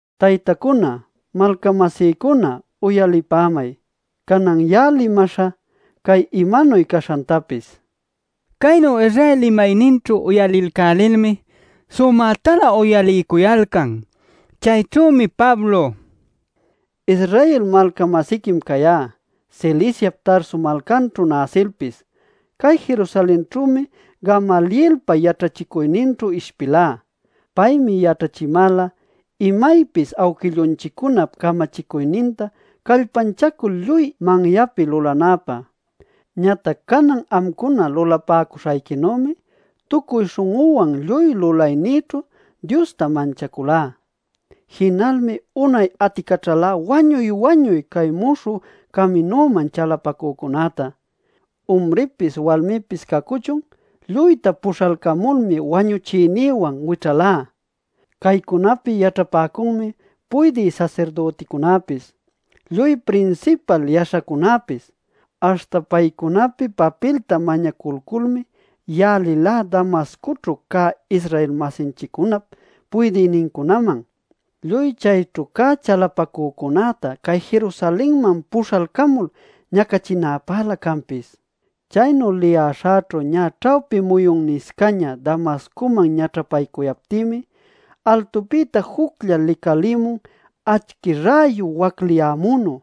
“Taytacuna, malca-masïcuna, uyalipämay. Canan ya'a limaśhä cay imanuy caśhantapis” nil. Caynu Israel limayninćhu uyalilcälilmi sumätalä uyaliycuyalcan. Chayćhümi Pablo: “Israel malca-masiquim cayá. Ciliciap Tarso malcanćhu näsilpis, cay Jerusalenćhümi Gamalielpa yaćhachicuyninćhu ishpilá. Paymi yaćhachimäla imaypis awquillunchiccunap camachicuyninta callpanchacul lluy manyapi lulanäpä. Ñatac canan amcuna lulapäcuśhayquinümi tucuy śhun'üwan lluy lulaynïćhu Diosta manchaculá. Jinalmi unay aticaćhalá wañuy-wañuy cay Muśhü Caminuman chalapacücunäta. Umripis walmipis cacuchun lluyta puśhalcamulmi wañuchiynïwan wićhalá. Caycunapi yaćhapäcunmi puydï sasirdüticunäpis, lluy prinsipal yaśhacunäpis. Aśhta paycunapi papilta mañaculculmi ya'a lilá Damascoćhu cä Israel-masinchiccunap puydïnincunaman, lluy chayćhu cä chalapacücunäta cay Jerusalenman puśhalcamul ñacachinäpälä canpis. “Chaynu liyäśhäćhu ñä ćhawpi muyunniscaña Damascoman ñaćhapaycuyaptïmi, altupïta juclla licalïmun acchi räyu wacliyämünu.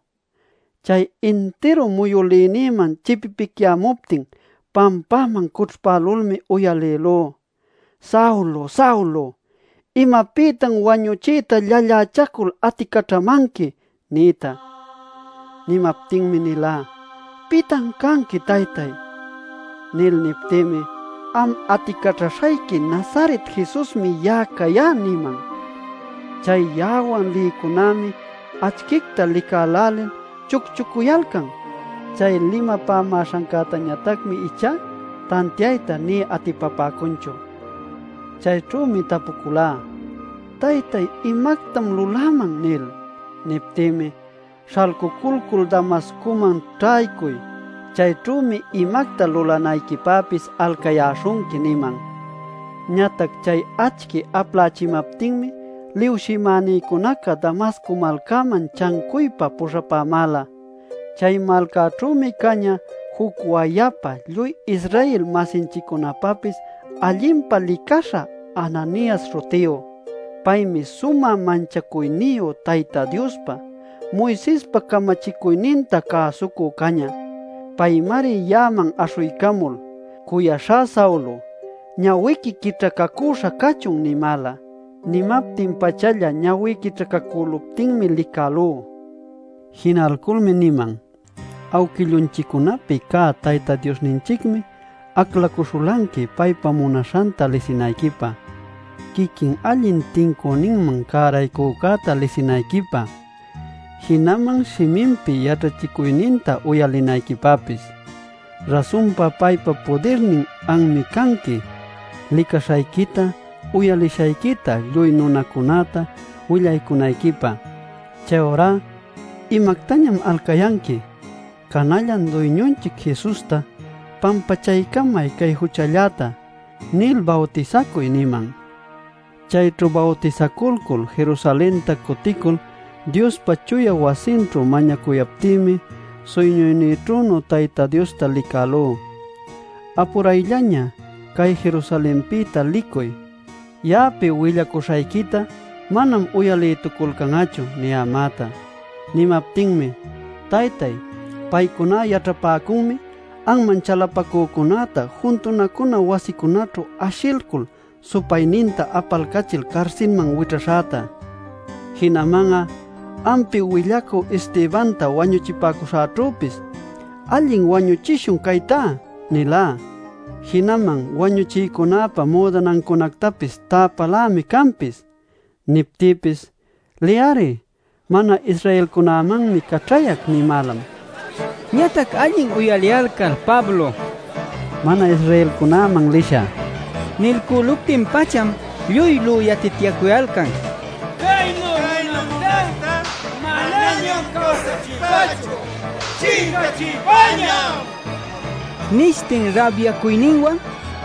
Chay intiru muyülïnïman chipipicyämuptin pampäman cućhpälulmi uyalïlú: ‘Saulo, Saulo ¿imapïtan wañuchiyta llallächacul aticaćhamanqui?’ niyta. “Nimaptinmi nilá: ‘¿Pitan canqui, Taytay?’ nil. “Niptïmi: ‘Am aticaćhaśhayqui Nazaret Jesusmi ya'a cayá’ niman. Chay ya'awan lïcunämi acchicta licälälil chucchucuyalcan. Chay limapamäśhancätañatacmi ichá tantiayta nï atipapäcunchu. “Chayćhümi tapuculá: ‘¿Taytay, imactam luläman?’ nil. “Niptïmi: ‘Śhalcuculcul Damascoman ćhaycuy. Chayćhümi imacta lulanayquipäpis alcayäśhunqui’ niman. Ñatac chay acchi aplächimaptinmi liwshimänïcunaca Damasco malcäman chancuypa puśhapämäla. “Chay malcäćhümi cañä juc wayapa lluy Israel-masinchiccunapäpis allinpa licaśha Ananias śhutiyu. Paymi sumä manchacuyniyu Tayta Diospa, Moisespa camachicuyninta cäsucü cañä. Paymari ya'aman aśhuycamul: ‘Cuyaśhá Saulo, ñawiqui quićhacacuśha cachun’ nimäla. Nimaptin-pachalla ñawí quićhacacüluptinmi licälú. Jinalculmi niman: ‘Awquillunchiccunapi cä Tayta Diosninchicmi aclacuśhulanqui paypa munaśhanta lisinayquipä, quiquin Allin Tincüninman Cäraycücäta lisinayquipä, jinaman shiminpi yaćhachicuyninta uyalinayquipäpis. Rasunpa paypa pudirnin anmi canqui licaśhayquita uyalishayquita lluy nunacunäta willacunayquipä. Chayurá ¿imactañam alcayanqui? Canallan Duyñunchic Jesusta: “Pampachaycamay cay juchalläta” nil bawtisacuy’ niman. “Chayćhu bawtisaculcul Jerusalenta cuticul Diospa chuya wasinćhu mañacuyaptïmi suyñuynïćhünu Tayta Diosta licälú: ‘¡Apurayllaña; cay Jerusalenpïta licuy! Ya'api willacuśhayquita manam uyalïtuculcan'achu’ niyämäta. “Nimaptinmi: ‘Taytay, paycuná yaćhapäcunmi anman chalapacücunäta juntunacuna wasicunaćhu ashilcul supayninta apalcachil carsilman wićhaśhäta. Jinaman'a ampi willacü Estebanta wañuchipäcuśhanćhüpis “Allin wañuchishun chaytá” nilá. Jinaman wañuchïcunäpa müdanancunactapis täpälämi canpis.’ “Niptïpis: ‘Liy-ari. Mana-Israelcunämanmi caćhayac’ nimälam” nil. Ñatac allin uyaliyalcal Pablo “mana-Israelcunaman lishä” nilcüluptin-pacham lluy lüyatityacuyalcan: “¡Caynu nunactá manañam cawsachiypächu! ¡Chincachiypäñam!” nishtin rabyacuyninwan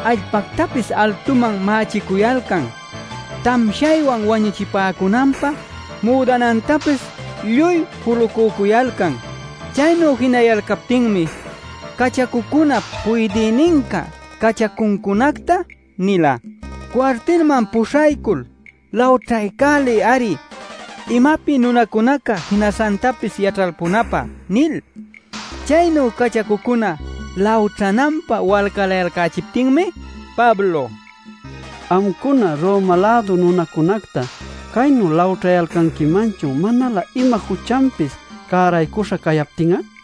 allpactapis altuman mächicuyalcan, tamshaywan wañuchipäcunanpä müdanantapis lluy julucücuyalcan. Chaynu jinayalcaptinmi cachacucunap puydïninca cachacuncunacta nila: “Cuartilman puśhaycul lawćhaycäliy-ari imapi nunacunaca jinaśhantapis yaćhalpunäpä” nil. Chaynu cachacucuna lawćhananpä walcalayalcächiptinmi Pablo: “¿Amcuna Roma-lädu nunacunacta caynu lawćhanquimanchun manalä ima juchanpis cäraycuśha cayaptin'a?” nila.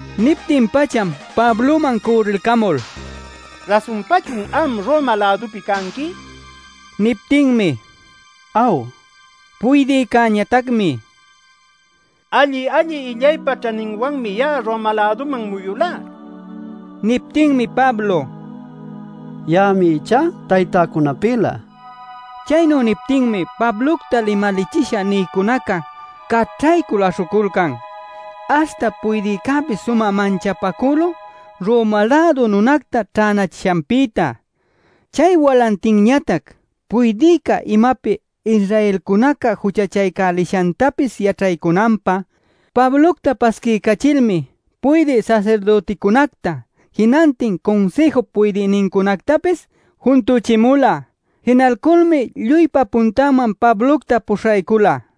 Niptin-pacham Pabloman cürrilcamul: “¿Rasunpachun am Roma-lädupi canqui?” nin. Niptinmi: “Aw” nin. Puydïcäñatacmi: “Alli-alli illaypa ćhaninwanmi ya'a Roma-läduman muyulá” nin. Niptinmi Pablo: “Ya'ami ichá taytäcunapïlä” nin. Chaynu niptinmi Pablocta limalichisha nïcunaca caćhaycul aśhuculcan. Aśhta puydïcäpis sumä manchapacülun Roma-lädu nunacta ćhänachishanpïta. Chay walantinñatac puydïca imapi Israelcunaca juchachaycälishantapis yaćhaycunanpä Pablocta pasquiycachilmi puydï sasirdüticunacta, jinantin Cunsïjup puydïnincunactapis juntuchimula. Jinalculmi lluypa puntanman Pablocta puśhaycula.